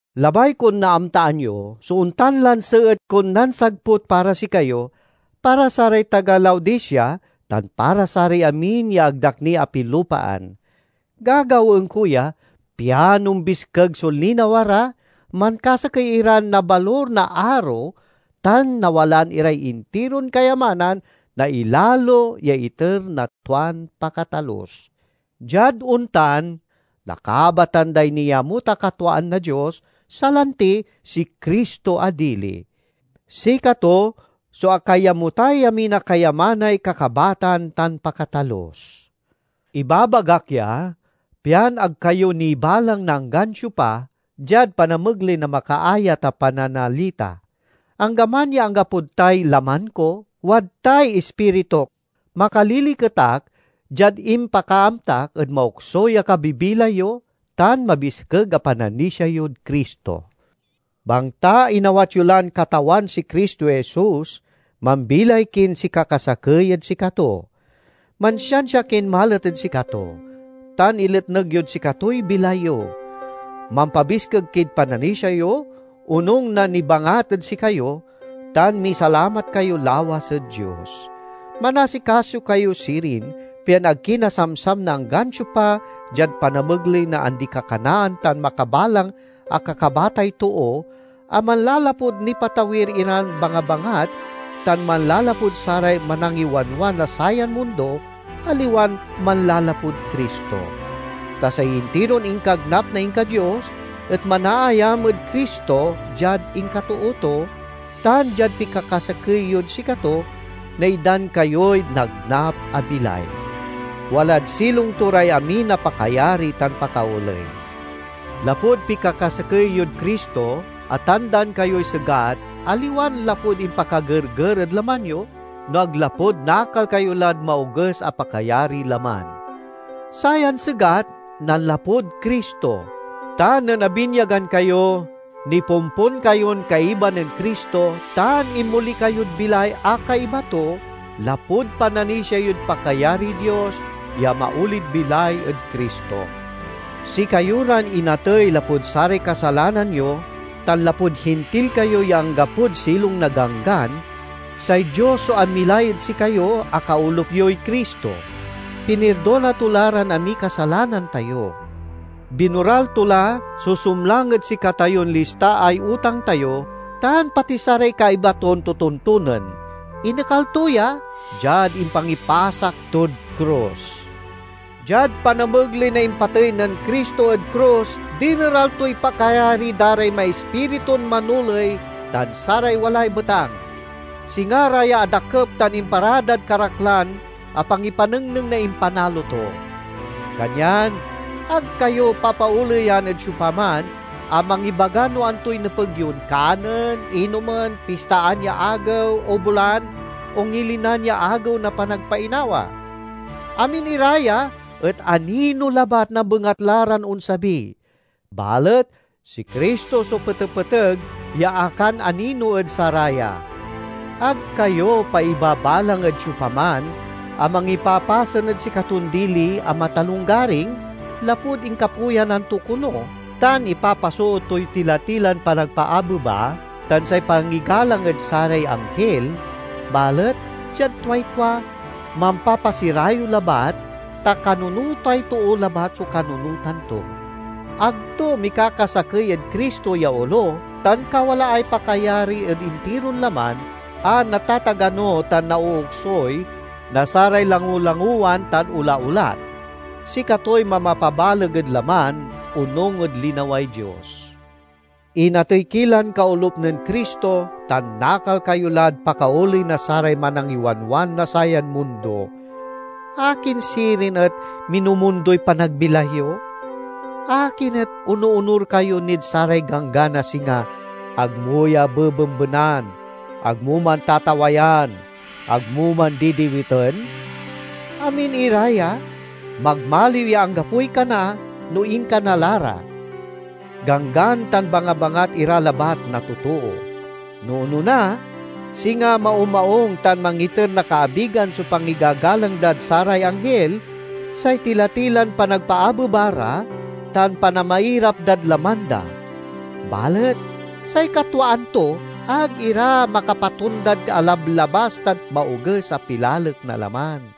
Labay kon naamtaan yo so ontan lan seet kon nansagput para sikayo, para saray taga Laodicea, tan para saray amin ya ag da ak ni apilupaan. Gagawaen ko ya, pian ombiskeg so linawa ra, mankasakey iran nabalur na aro, tan nawalaan iray intiron kayamanan na ilalo ya iter na tuan pakatalus. Diad ontan, nakabatan day niamut a katwaan na Dios, salanti si Cristo a dili. Sikato so akaiyamutay amin a kayamanay kakabatan tan pakatalus. Ibabagak ya, pian ag kayo nibalang na anggan siopa, diad panamegley na makaayat a pananalita. Anggaman ya anggapod tay laman ko, wadtay ispirituk. Makaliliket ak diad impakaamtak ed maoksuy a kabibilay yo tan mabiskeg a pananisia yod Cristo. Bangta inawat yo lan Katawan si Cristo Jesus, mambilay kin sikakasakey ed sikato. Mansiansia kin malet ed sikato tan iletneg yod sikatoy bilay yo. Mampabiskeg kid pananisia yo onung na nibangat ed sikayo, tan misalamat kayo lawas ed Dios. Manasikaso kayo sirin, pian ag ki nasamsam na anggan siopa diad panamegley na andi-kakanaan tan makabalang a kakabatay too a manlalapud nipatawir iran bangabangat tan manlalapud saray manangiwanwan na sayan mundo, aliwan manlalapud Cristo. Ta say intiron inkagnap na inka-Dios et manaayam ed Cristo diad inkatoo to, tan diad pikakasakey yod sikato, naitdan kayoy nagnap a bilay. Walad silong to ray amin a pakayari tan pakaoley. Lapud pikakasakey yod Cristo atandaan kayoy segat aliwan lapud impakagerger ed laman yo, no ag lapud nakal kayo lad maoges a pakayariy laman. Sayan segat nanlapud Cristo. Ta nen abinyagan kayo, nipompon kayon kaiba nen Cristo tan inmoli kayod bilay a kaiba to, lapud pananisia yod pakayariy Dios, ya amaolid bilay ed Cristo. Sikayo ran inatey lapud saray kasalanan yo, tan lapud Hintil kayo ya anggapod silong na Ganggan, say Dios so amilay ed sikayo a kaolup yoy Cristo; pinirdona to la ran amiy kasalanan tayo. Binoral to la so sumlang ed sikatayon listaay utang tayo, tan pati saray kaiba ton totontonen. Inekal to ya, diad impangipasak tod krus. Diad panamegley na impatey nen Cristo ed krus, dineral toy pakayari da ray maispiritun manoley tan saray walay betang. Singa ra ya adakep tan imparadad karaklan a pangipanengneng na impanalo to. Kanyan ag kayo papaoleyan ed siopaman a mangibaga no antoy nepeg yon kanen, inomen, pistaan ya agew o bulan, o ngilinan ya Agew na Panagpainawa. Amin ira ya et anino labat na bengatla ran onsabi; balet si Cristo so petepeteg ya akananino ed saraya. Ag kayo paibabalang ed siopaman a mangipapasen ed sikaton dili a matalonggaring, lapud inkapuyanan to kono tan ipapasoot toy tila-tilan panagpaabeba tan say pangigalang ed saray anghil, balet diad tuay tua, mampapasirayew labat, ta kanunotay too labat so kanunotan to. Ag to mikakasakey ed Cristo ya olo tan kawalaay pakayari ed intiron laman, a natatagano tan naooksuy na saray langolangowan tan olaolat. Sikatoy mamapabaleg ed laman, onung ed linaway Dios. Inatey ki lan kaolup nen Cristo tan nakal kayo lad pakaoley na saray manangiwanwan na sayan mundo. Akin sirin et minumundoy panagbilay yo? Akin et onoonur kayo nid saray ganggan a singa, "Ag mo ya bebembenan," "Ag mo man tatawayan," "Ag mo man didiwiten"? Amin ira ya, magmaliw ya anggapoy kana, no inkana la ra; ganggan tan bangabangat ira labat na totoo. No onona, singa maumaung tan mangiter na kaabigan so pangigagalang dad saray anghil, say tila-tilan panagpaabeba ra, tan panamairap dad laman da. Balet say katwaan to, ag ira makapatondad alablabas tan maoges a pilalek na laman.